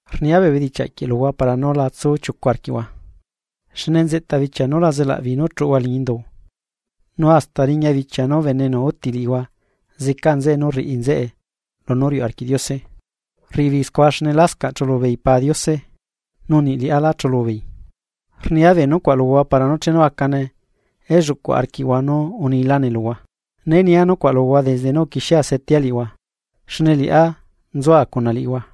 ’Rnia bee bedichiaꞌ quieꞌ luhua para nú la tsu chiucu arquiꞌhua. Xne nzeꞌta bichia nú la zelaꞌbeei nú chuꞌuhua liñi indu, nu hasta riña bichia nú bene enu úti liꞌihua zeca nzeꞌe nú rriꞌi nzeꞌe lunú riuꞌ arquiꞌ Diose. Rriꞌi beei scua xne lascaꞌ chulu beei Pa Diose nu niꞌ liꞌá lá chulu beei. Rnia bee nucuaꞌ luhua para nú chenu acane elluꞌcu arquiꞌhua nú unilane luhua. Né nia nucuaꞌ luhua desde nú uquixiea setea liꞌihua, xne liꞌá nzua cuna liꞌihua.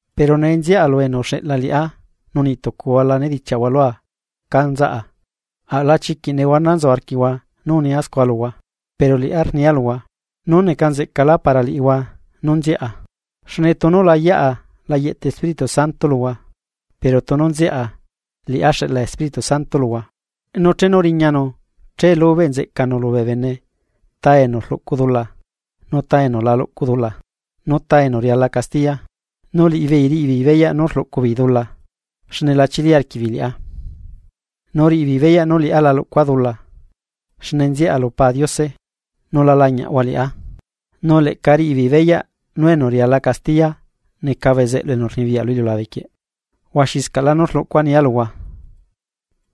’Pero nee nziaꞌa lu enu uxeꞌla liꞌá nu niꞌtucuhua la nedichiaꞌ lua cá nzaꞌa, aꞌla chiquiꞌ nehuana nzu arquiꞌhua nú unia scua luhua. Pero liꞌá rnia luhua: nú neca nzeꞌcalá para liꞌihua nú nziaꞌa. Xne tunu la yaꞌa la yeꞌta Espíritu Santo luhua pero tunu nziaꞌa liꞌá xeꞌla Espíritu Santo luhua. Nu chenu riñanu che lubeꞌ nzeꞌcanu lubee bene ta enu rluꞌcu dula, nu ta enu la luꞌcu dula, nu ta enu riala castiya. Nu liꞌibeei riꞌibeei beyaꞌ nú rluꞌcu beei dula xne la chili arquiꞌbeei liꞌá. Nu riꞌibeei beyaꞌ nú liꞌá la luꞌcua dula xne nziaꞌa lu Pa Diose, nu la lañiaꞌhua liꞌá, nu leꞌca riꞌibeei beyaꞌ nú enu riala castiya neca bezeꞌlu enu rnibiyaꞌ lu iliulabe quieꞌ. ’Huaxiscaꞌlá nú rlucua nia luhua,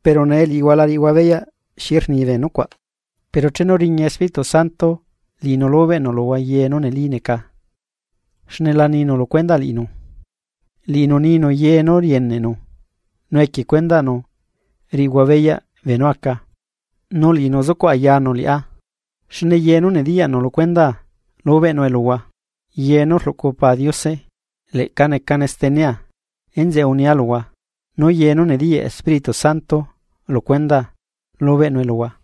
pero nee liꞌihua la riꞌihua beyaꞌ xi rni bee nucuaꞌ. Pero chenu riña Espíritu Santo liꞌinu lubeꞌnu luhua ye nú neli neca xne la ninu lu cuendaꞌ liꞌinu, liꞌinu ninu ye nú rieneꞌnu nu equie cuendaꞌnu riꞌihua beyaꞌ beenú aca. Nu liꞌinu zucuꞌ ayanu liꞌá, xne ye nú nediyaꞌnu lu cuendaa lubeꞌnue luhua. Ye nú rluꞌcu Pa Diose, leꞌca necane stenea enzeꞌe unia luhua nú ye nú nediyaꞌ Espíritu Santo lu cuendaa lubeꞌnue luhua.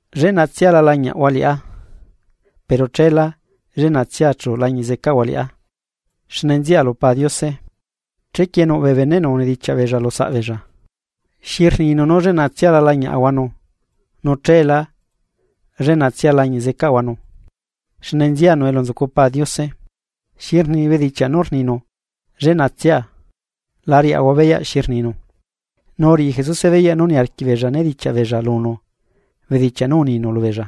’Lleꞌnatsia la lañiaꞌhua liꞌá, pero cheelá lleꞌnatsia chu lañiꞌ zecaꞌhua liꞌá, xne nziaꞌa lu Pa Diose. Chequie nuꞌ bee beneꞌnu unedichiaꞌ beella lu saꞌbeella: ―¿Xi rninu nú lleꞌnatsia la lañiaꞌahuanu nu cheelá lleꞌnatsia lañiꞌ zecaꞌahuanu xne nzianu elu nzucu Pa Diose? ¿Xi rni bedichiaꞌ nú rninu “lleꞌnatsia”? La riaꞌahua beyaꞌ xi rninu. Nu uriꞌi Jesuse beyaꞌ nú niarquiꞌ beella nedichiaꞌ beella lunu bedichiaꞌ nú uninu lubeella: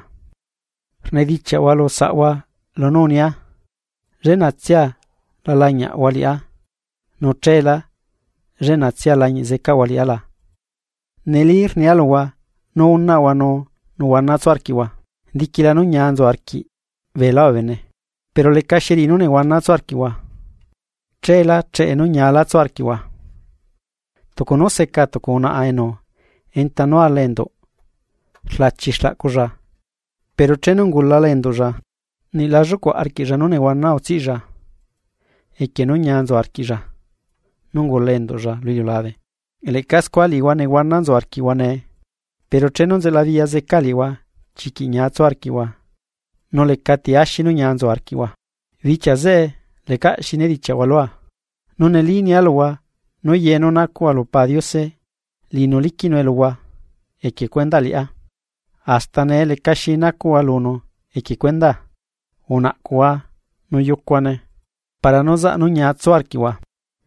―¿Rnedichiaꞌhua lu saꞌhua lunú unia, lleꞌnatsia la lañiaꞌhua liꞌá nu cheelá lleꞌnatsia lañiꞌ zecaꞌhua liꞌá la? Neli rnia luhua nú unaꞌhua nu nehuana tsu arquiꞌhua, diquila nú ñia nzu arquiꞌ beelá bee bene. Pero lecaxi riꞌi nú nehuana tsu arquiꞌhua, cheela cheꞌe nú ñiaꞌla tsu arquiꞌhua. Tucu nú seca tucu unaꞌa enu enta nú ala enduꞌ rlachi xlaꞌculla pero chenu ungulala enduꞌlla, niꞌ la llucuaꞌ arquiꞌlla nú nehuana utsiꞌlla equie nú ñia nzu arquiꞌlla nú ungula enduꞌlla lu iliulabe. Leꞌca scua liꞌihua nehuana nzu arquiꞌhua nee, pero chenu nzelabiꞌya zeca liꞌihua chiquiꞌ ñia tsu arquiꞌhua nu lecati axi nú ñia nzu arquiꞌhua. ’Bichia zeꞌe lecaꞌ xi nedichiaꞌhua lua. Nu neli nia luhua nú ye nú nacuꞌhua lu Pa Diose, liꞌinu liquiꞌnue luhua equie cuendaꞌ liꞌá. Hasta nee lecaxi nacuꞌhua lunú equie cuendaa, unaꞌcuhua nu yucuhuane para nú zaꞌ nú ñia tsu arquiꞌhua.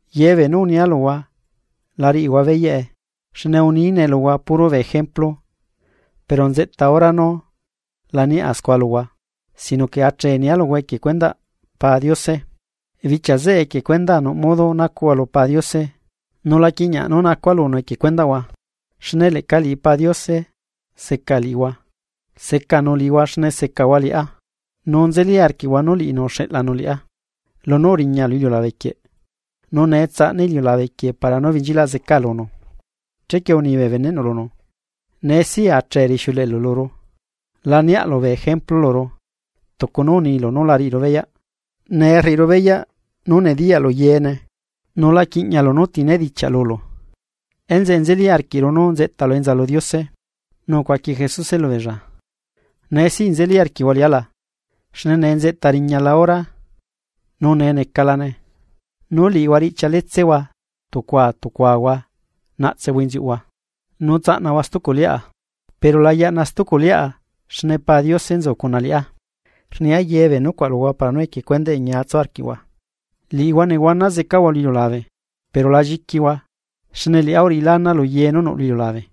’Ye beenú unia luhua la riꞌihua beyaꞌe xne unine luhua puro bee ejemplu pero nzeꞌta hora nú la niaꞌa scua luhua, sino que achee nia luhua equie cuendaꞌ Pa Diose. Bichia zeꞌe equie cuendaa nuꞌ modo nacuꞌhua lu Pa Diose nu la quiꞌñiaꞌ nú nacua lunu equie cuendaꞌhua, xne leꞌca liꞌi Pa Diose seca liꞌihua, secanu liꞌihua xne secahua liꞌá nu nzeli arquiꞌhua nú liꞌinu uxeꞌlanu liꞌá. Lunú uriña lu iliulabe quieꞌ, nu nee tsaꞌna iliulabe quieꞌ para nú benchilaꞌ zeca lunu. Chequie uni bee beneꞌnu lunu: ―Nee siꞌ achee rixiuleꞌelu luru, la niaꞌlu bee ejemplu luru tucu nú unilu nú la riꞌiru beyaꞌ. Nee rriꞌiru beyaꞌ nú nediyaꞌlu yeene nu la quiꞌñialu nú ti nedichiaꞌ lulu, enzeꞌe nzeli arquiꞌru nú nzeꞌtalu enza lu Diose. Nu ucuaqui Jesuse lubeella: ―¿Nee siꞌ nzeli arquiꞌhua liꞌá la? Xne nee nzeꞌta riñala hora, nu nee necalane, nú liꞌihua riꞌchialetsehua tucua tucuahua naꞌtsehua inziuꞌhua, nu tsaꞌnahua stuculiꞌa. Pero la yaꞌna stuculiꞌa xne Pa Diose nzu cuna liꞌá Rnia ye bee nucuaꞌ luhua para nú equie cuendaꞌe ñia tsu arquiꞌhua. Liꞌihua nehuana zecahua lu iliulabe, pero la lliquihua xne liꞌá uriꞌila ana luye nú nuꞌ lu iliulabe.